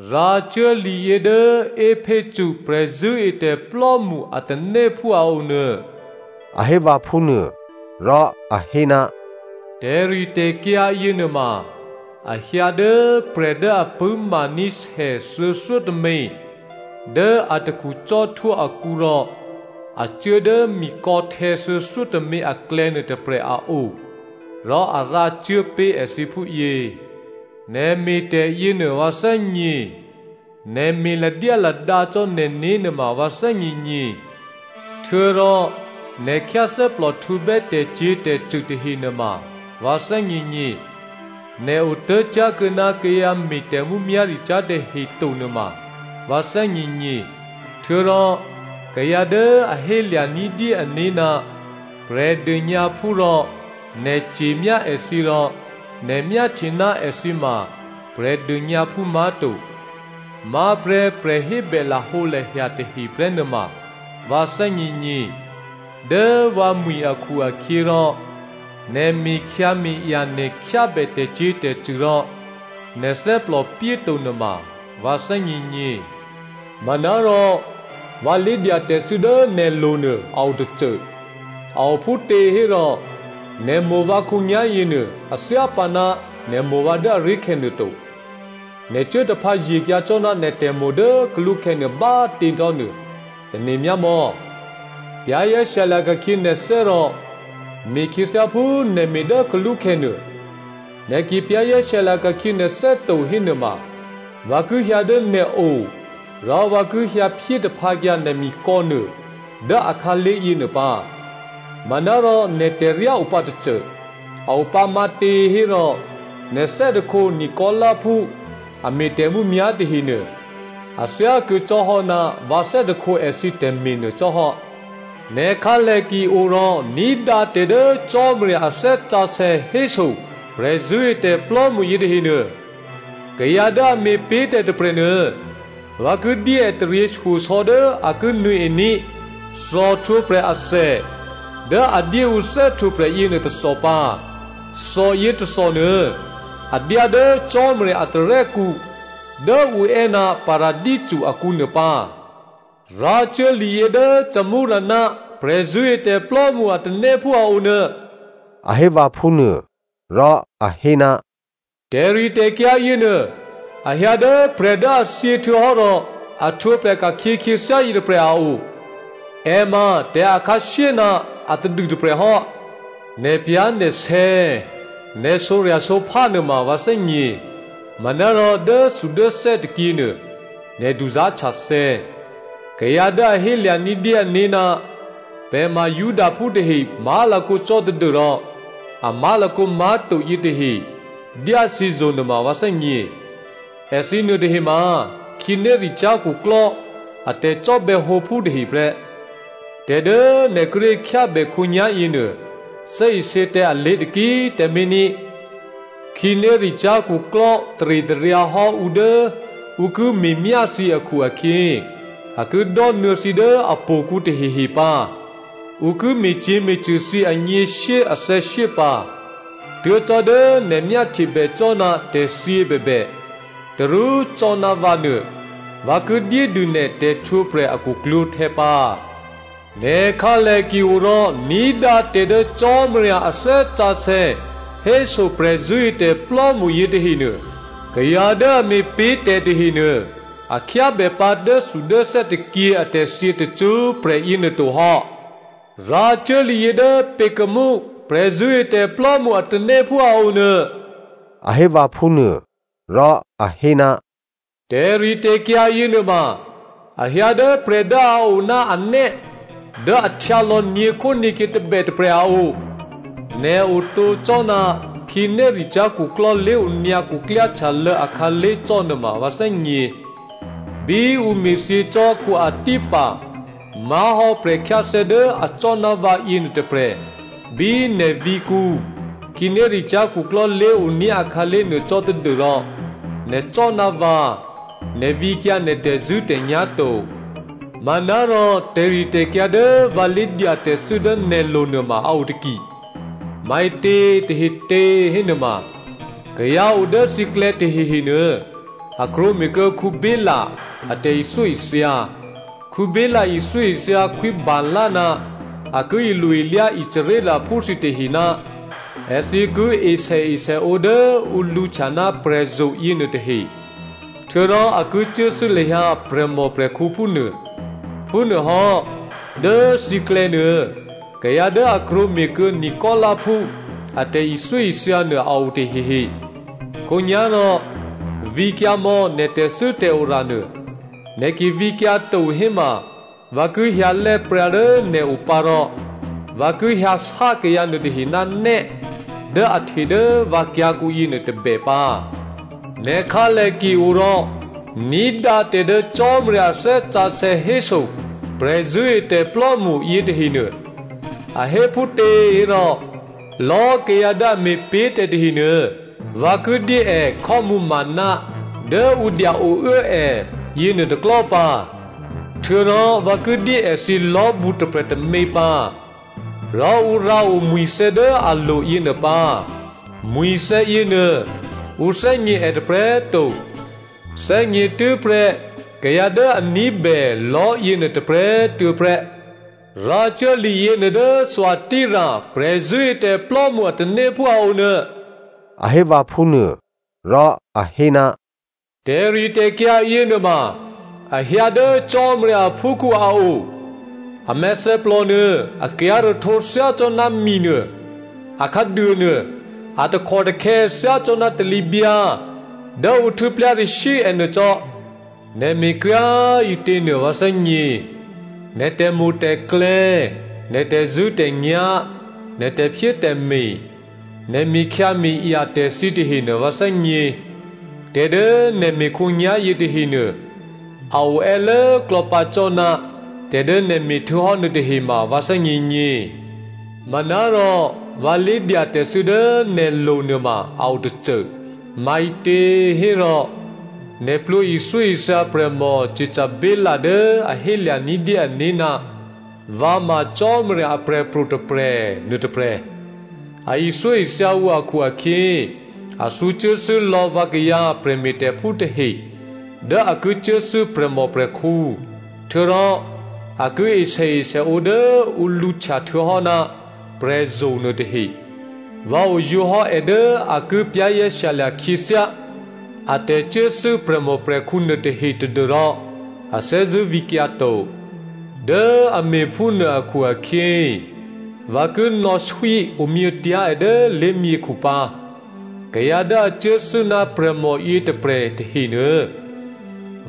“Rǎcuố liyě dố Epheso prè̤zṳ̂́etè̤plò́mṳ a tanéphú a o nuô,” a hé vǎ phúnuô. Rò a hé, “Tè̤ritè̤kyǎ yěnuôma a hyǎ dố prè̤ dố a pṳ̂́maní̤ sè thuô̌thyótômě dố atakhu cò́htwó akǔ rò a cuố dố mikò̌htè̌ thuô̌thyótômě aklè̌nuô tôprè̤ a o rò a rǎcuốpé̤ èthǐ phúyě, nè̤ me̤ tè̤yěnuô vǎ thè́gně, nè̤ me̤ ladyáladǎ cò́ nè̤né̤ nuôma꤮ vǎ thè́gněgně, htuô̌rò nè̤ khyáthè́plòhtǔbè́ tè̤cyě̤tè̤cṳ̂ tahe nuôma꤮ vǎ thè́gněgně. Nè̤ otố̤cyá̤kuô̌ ná kayǎ me̤ tè̤mǔmyá̤ricyá̤ tahe to nuôma꤮ vǎ thè́gněgně. Htuô̌rò kayǎ dố a hé lya̤ ní̤dyé ané̤ ná Prè̤dônyǎphú rò nè̤ ce̤myá èthǐ rò nè̤ myáhtye ná èthǐ ma Prè̤dônyǎphú má̤to, má̤prè́ prè̤hébè lahǒlahya tahe prè́ nuôma꤮ vǎ thè́gněgně. Dố vǎmwi̤ akhu-akhyěrò, nè̤ me̤khyǎme̤aya nè̤ khyábè tè̤cyě̤tè̤cṳ̂ rò nè̤ thè́plò pyéto nuôma꤮ vǎ thè́gněgně. “Manárò vǎ lé̤dyatè̤thû́ dố nè̤lo̤ nuô a o tôcô, a o phútěhérò nè̤ mo̤ vǎ khǒnyá̤yěnuô a thyá pǎ ná nè̤ mo̤ vǎ dố aré̤khè̌ nuôto. Nè̤ cuố taphǎye̤kyǎ cò́ ná nè̤ tè̤mo̤ dố kalúkhè̌nuô bá꤮ tě cò́nuô tane̤ myámò̌. Za̤ ní̤dû nè̤né̤ rò me̤khyě thyáphú nè̤ me̤ dố kalúkhè̌nuô. Nè̤ ki za̤ ní̤dû nè̤né̤ to hénuôma vǎ ki hyǎ dố nè̤o rò vǎ ki hyǎphyé taphǎkyǎ nè̤ mikò̌nuô dố akhǎlé̤ yěnuô pǎ. Manárò nè̤ tè̤ryá opǎtôcô. A o pǎ matěhérò nè̤ thè́hte Nicolaitaphú a me̤ tè̤mǔmyá̤ tahenuô a thyákuô̌ cò́ hò́ ná vǎ thè́hte èthǐ tè̤me̤ nuô cò́hò́. “Nè̤ khǎlè ki o rò ní̤dǎ tè̤ dố Cò́marya a Thè́ Sǎsè̌ héso prè̤zṳ̂́etè̤plò́mṳ yětahenuô. Kayǎ dố a me̤pé̤tè̤ tôprè̤nuô, vǎ ki dyé è taryěshyosò̌ dố a ki nuô̌ení̤ thòhtwǒprè̤ athè dố a dyéǔ thè́htwǒprè̤ yěnuô tôthò pǎ. Thòyě tôthònuô a dyá dố Cò́marya a tarè́kǔ dố ǔ è́ ná Paradisǔ akǔnuô pǎ.” “Rǎcuố liyě dố Smyrna prè̤zṳ̂́etè̤plò́mṳ a tanéphú a onuô,” a hé vǎ phúnuô. Rò a hé, “Tè̤ritè̤kyǎ yěnuô, a hyǎ dố prè̤ dố a thyě htuô̌hò́ rò a htwǒprè̤ ka̤khyě khyěthyá yětôprè̤ a o. È ma tè̤akhǎshyé ná atadû tôprè̤hò́. Nè̤pyá̤nè̤sè̌, nè̤ sǒrya̤sǒphá nuôma vǎ thè́gně. Manárò dốthudốthè́ tôkyě nuô, nè̤ duzá̤htyathè̌. Kayǎ dố a hélya̤ ní̤dyé ané̤ ná pè̤ ma Judaphú tahe má̤lakǒ cò́ tadû́rò a má̤lakǒ má̤to yětahe dyá thǐzo̤ nuôma vǎ thè́gně. Èthǐ nuôtahe ma khǐnéricyá̤ khuklò́ a tè̤cò́bè̌ hǒphú tahe prè́. Tè̤dố nè̤ kíré̤ khyábè khǒnyá̤ yěnuô, thè́isě tǎ alé̤ taki꤮ tǎmé̤ ní. Khǐnéricyá̤ khuklò́ taritaryǎ hò́ ǔ dố ǔ ki me̤myá thǐ akhu-akhyě, a ki dò́nuô̌ thǐ dố htò̌kǔ tahehe pǎ. Ǔ ki me̤cyě̤me̤cṳ̂ thǐ anyěshyé athè̌shyé pǎ. Tuố̤ cò́ dố nè̤ myáhtyebè cò́ ná tè̤thyě bèbè, tarú cò́ ná vǎ nuô, vǎ ki dyédû nè̤ tè̤htwǒprè̤ a khuklwǒ̤htè̌ pǎ. “Nè̤ khǎlè ki o rò ní̤dǎ tè̤ dố Cò́marya a Thè́ Sǎsè̌ héso prè̤zṳ̂́etè̤plò́mṳ yětahenuô. Kayǎ dố a me̤pé̤tè̤ tahenuô a khyábè pǎ dốthudốthè́ tôkyě atè̤thyě tacṳ́prè̤ yěnuô to hò́.” “Rǎcuố liyě dố Pergamum prè̤zṳ̂́etè̤plò́mṳ a tanéphú a o nuô,” a hé vǎ phúnuô. Rò a hé, “Tè̤ritè̤kyǎ yěnuôma a hyǎ dố prè̤ dố a o ná anè́ dố a htyǎlò̌ nyě̤khónyě̤kyě tôbè tôprè̤ a o. Nè̤ otǒ cò́ ná khǐnéricyá̤ khuklò́ lé̤onyǎ khuklyáhtyalô̌ akhǎlé̤ cò́ nuôma vǎ thè́gně. Bí ǔ me̤thyě cò́ Antipa má̤hò́ prè̤khyáthè́ dố acò́ ná vǎyě nuôtôprè̤ bí nè̤ vǐ̤kǔ khǐnéricyá̤ khuklò́ lé̤oní̤ akhǎlé̤ nuô cò́ tadû́rò nè̤ cò́ ná vǎ, nè̤ vǐkyǎ nè̤ tè̤zṳ̂́tè̤nyá̤ to. “Manárò tè̤ritè̤kyǎ dố vǎ lé̤dyatè̤thû́ dố nè̤lo̤ nuôma a o taki, maǐtě tahetě hénuôma, kayǎ o dố thǐklè̌ tahehe nuô, a krwǒme̤kuô̌ Balaam a tè̤ithyóithya. Balaam ithyóithya Khwí Balak ná a ki ilo-ilyá Israelphú thǐtahe ná èthǐ ki e sèesèǒ dố ǔ lǔhtya ná prè̤zo̤ yěnuôtahe, htuô̌rò a ki cuốthû́ lahyǎ prè̤mòprè̤khǔ phúnuô. Phúnuôhò́, dố thǐklè̌nuô kayǎ dố a krwǒme̤kuô̌ Nicolaitaphú a tè̤ithyóithya nuô a o tahehe. Khǒnyá̤rò vǐkyǎmò̌ nè̤ tè̤thû́tè̤ora nuô. Nè̤ ki vǐkyǎ to héma vǎ ki hyǎlè́ pryǎ dố nè̤ o pǎ rò vǎ ki hyǎsá kayǎ nuôtahe ná nè́ dố a hte dố vǎ kyǎ̤kǔ yěnuô tôbè pǎ. “Nè̤ khǎlè ki o rò ní̤dǎ tè̤ dố Cò́marya a Thè́ Sǎsè̌ héso prè̤zṳ̂́etè̤plò́mṳ yětahenuô. A hé phútěhérò, lò̌꤮ kayǎ dố a me̤pé̤ tè̤ tahenuô vǎ ki dyé è khò́mǔmǎna dố ǔ dya-ouố è yěnuôtôklò̤́ pǎ. Htuô̌rò vǎ ki dyé èthǐ lò̤́bǔ tôprè̤ tômě pǎ, rò ǔ rǎo mwi̤thè̌ dố alo̤ yěnuô pǎ. Mwi̤thè̌ yěnuô ǔ thè́gně è tôprè̤꤮ to, thè́gně tû́prè́ kayǎ dố a ní̤bè lò̤́yěnuô tôprè̤꤮ tuô̌ prè́.” “Rǎcuố liyěnuô dố Thyatira prè̤zṳ̂́etè̤plò́mṳ a tanéphú a o nuô,” a hé vǎ phúnuôrò a hé, “Tè̤ritè̤kyǎ yěnuôma a hyǎ dố Cò́marya aphúkhǔ a o. A mèthèplò nuô a kyǎ̤rahtǒ thyácò́ná minuô, a khǎduônuô, a takhòtakhè̌ thyácò́ná talǐbyǎ dố ǔ htû́plyarashyǐ ènuô cò́. Nè̤ me̤kryá꤮ ǐtěnuô vǎ thè́gně. Nè̤ tè̤mo̤tè̤klè̌, nè̤ tè̤zṳ̂́tè̤nyá̤, nè̤ tè̤phyétè̤me̤, nè̤ me̤khyǎme̤aya tè̤ thǐ tahenuô vǎ thè́gně. Tè̤dố nè̤ me̤ khǒnyá̤yě tahenuô, a o è́lốklò̌ pǎ cò́ ná tè̤dố nè̤ me̤htuô̌hò́ nuôtahe ma vǎ thè́gněgně. “Manárò vǎ lé̤dyatè̤thû́ dố nè̤lo̤ nuôma a o tôcô. Maǐtě hérò, nè̤ plwǒ ithyóithya prè̤mò Jezebel dố a hélya̤ ní̤dyé ané̤ ná vǎ ma Cò́marya aprè̤pro̤ tôprè̤, nuôtôprè̤. È ithyóithya ǔ akhu-akhyě, a thǔcuốthû́ lò̌ vǎkayǎ prè̤me̤tè̤phú tahe dố a ki cuốthû́ prè̤mòprè̤khǔ, htuô̌rò a ki e sèesèǒ dố ǔ lǔhtya htuô̌hò́ ná prè̤zo̤ nuôtahe. Vǎ oyǒ hò́ è dố a ki za̤ ní̤dû khyěthyá a tè̤cuốthû́ prè̤mòprè̤khǔ nuôtahe tadû́rò a thè́zṳ̂́ vǐkyǎ to. Dố a me̤phúnuô akhu-akhyě vǎ ki nò̌swí omyětyá̤ è dố lé̤myěkhu pǎ. Kayǎ dố a cuốthû́ ná prè̤mò yětôprè̤ tahenuô,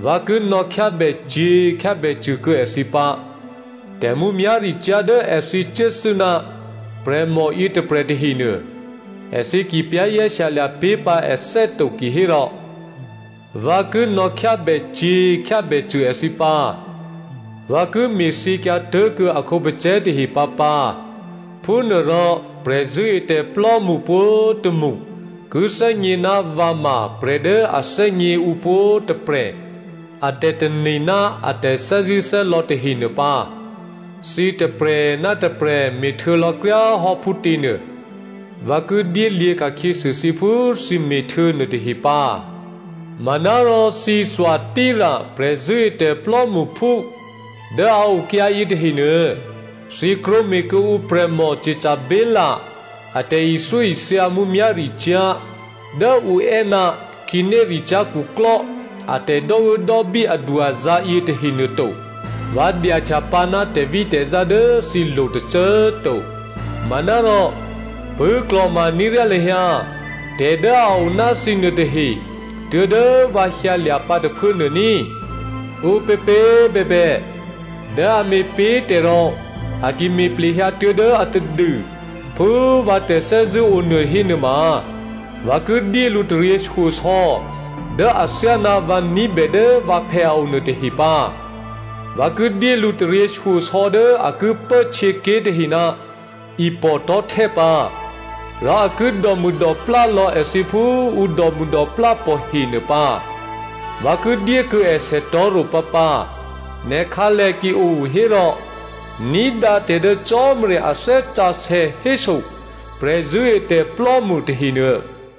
vǎ ki nò̌khyábècyě̤ khyábècṳ̂ kuô̌ èthǐ pǎ. Tè̤mǔmyá̤ricyá̤ dố èthǐ cuốthû́ ná prè̤mò yětôprè̤ tahenuô, èthǐ ki za̤ ní̤dû pé̤ pǎ ané̤ to kihérò vǎ ki nò̌khyábècyě̤ khyábècṳ̂ èthǐ pǎ. Vǎ ki me̤thyěkyǎ tố̤kuô̌ a khǒpacè̤̌ tahe pǎpǎ. Phúnuôrò prè̤zṳ̂́etè̤plò́mṳ pwǒ̤tômṳ ki thè́gně ná vǎ ma prè̤ dố a thè́gně ǔ pwǒ̤꤮ tôprè̤ a tè̤tane̤ ná a tè̤thè́zṳ̂́thè́lò̌ tahe nuô pǎ. Thǐ tôprè̤ ná tôprè̤ me̤htuô̌ lò̌kryáhò́ phútě nuô, vǎ ki dyélyě̤ ka̤khyěsû thǐ phú thǐ me̤htuô̌ nuôtahe pǎ. Manárò thǐ Thyatira prè̤zṳ̂́etè̤ plò́mṳphú dố a okyǎ yětahenuô, thǐ krwǒme̤ kuô̌ǔ prè̤mò Jezebel a tè̤ithyóithya mǔmyá̤ricyá̤ dố ǔ è́ ná khǐnéricyá̤ khuklò́ atè̤ dò́uốdò́bí adu-azǎ̤ yětahe nuôto. Vǎ dyahtyapǎ ná tè̤vítè̤zá dố thǐlo̤ tôcô꤮ to. Manárò pṳ̂́klò̤ma ní̤ ryá lahyǎ tè̤ dố a o ná thǐ nuôtahe tuố̤dố vǎ hyǎlya̤ pǎ tôphuố nuô ní꤮. “Ǔpěpě꤮ bèbè dố a me̤pé̤tè̤ rò a ki me̤ plehyǎ tuố̤dố atadû phú vǎ tè̤thè́zṳ̂́ onuô hénuôma, vǎ ki dyé lǔ taryěshyosò̌ dố athyáná vǎ ní̤bè dố vǎphè̌ a o nuôtahe pǎ. ‘Vǎ ki dyé lǔ taryěshyosò̌ dố a ki pố htyěké̤ tahe ná ipò̤ tò̤́htè́ pǎ, rò a ki dòmûdòplá lò̌ èthǐ phú ǔ dòmûdòplá pò̤he nuô pǎ.’ Vǎ ki dyékuô̌ è sètò̤́ro̤ pǎpǎ. Nè̤ khǎlè ki o hérò ní̤dǎ tè̤ dố Cò́marya a Thè́ Sǎsè̌ héso prè̤zṳ̂́etè̤plò́mṳ tahenuô.”